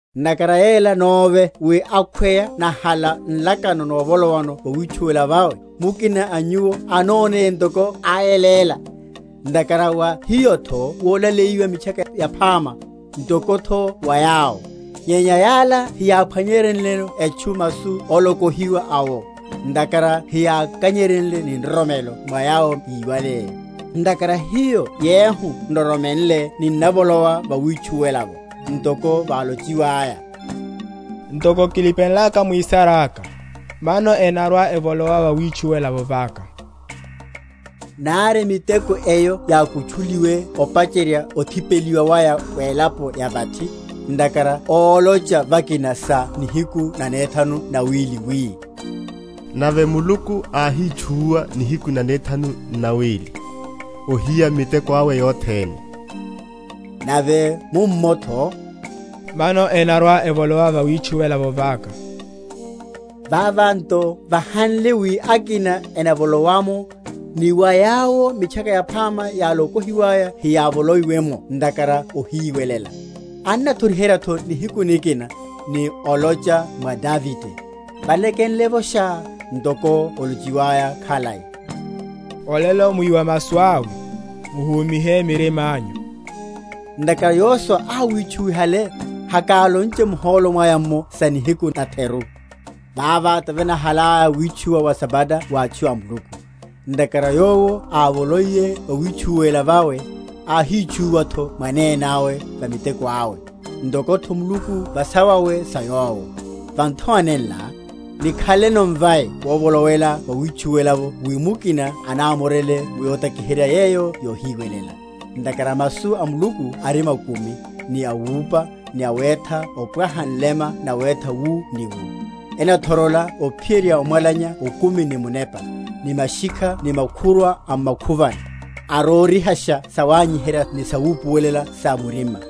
Ntakhara yela nóve wi akhweya nahala nlakano novolowa vawitchuwela vawe, mukina a nyuwo anoneye ntoko áyeléla. Ntakhara wa hiyotho wolaleyiwa Mitchaka Yaphama, ntokotho wa yawo; nyenya yala heyáphwanyenryeno etchu masu ólokohiwa awo, ntakhara heyákanyeryeiye ni nroromelo mwa yawo yíwale. Ntakhara hiyo yehu nroromenle ninnavolowa vawitchuwela’vo, ntoko válochiwaya, Ntoko kilipenlaka mwisaráka, Mano enarwa‐evolowa vawitchuwela vaka: nari miteko eyo yákutchuliwe opacherya othipeliwa waya welapo ya vathi. Ntakhara ólocha vakina sa nihiku nanethanu n’nawili, wi, Nave Muluku áhítchúwa nihiku nanethanu n’nawili, ohiya miteko awe yothene. Nave mummotho, Mano enarwa‐evolowa vawitchuwela vaka. Vava nto vahanle wi akina enavolowa’mo, ni wa yawo Mitchaka Yaphama yálokohiwaya heyávoloiye’mo ntakhara ohiwelela, annathoriheryatho nihiku nikina, ni olocha mwa Davide, valekenlevosha, ntoko olochiwaya khalai, Olelo mwíwa masu awe, muhúmihe mirimányu. Ntakhara Yosua áwítchúwihale, hakalonche muhólo mwaya’mmo sa nihiku natheru. Vava tivanahalaya witchuwa wa Sabata wa atchu a Muluku. Ntakhara yowo ávoloiye vawitchuwela vawe, áhítchúwatho mwanenáwe va miteko awe, ntokotho Muluku va sawawe sa Yowo. Va nthowa nenla, nikhaleno mvai wovolowela vawitchuwela’vo wi mukina anamorele mu yotakiherya yeyo yohiwelela. Ntakhara masu a Muluku ari makumi, ni awupa, ni awétha opwaha nlema nawétha wu ni wu, enathorola ophiyerya omwalanya okumi ni munepa, ni mashikha ni makhurwa a m’makhuvani, arórihasha sawanyiherya ni sawupuwelela sa murima.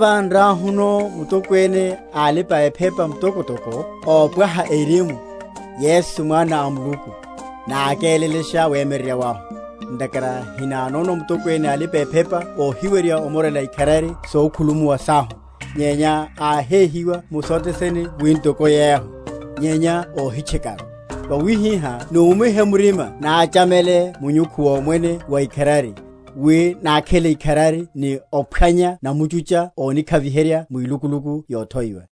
Vava nriahuno Mutokwene a alipa‐ephepa mtokotoko, ópwaha erimu, Yesu Mwana a Muluku, nákélelashe wemyeryerya wahu. Ntakhara hinanono Mutokwene a alipa‐ephepa óhiwerya omorela ikharari sokhulumuwa sahu; nyenya áhéhiwa mu sothe sene wi ntoko yehu, nyenya óhitchekaru. Vawihihá numihe murima nachamele munyukhu womwene wa ikharari, wi nakhele ikharari ni ophwanya namutchucha ónikhaviherya mwilukuluku yothoiwa.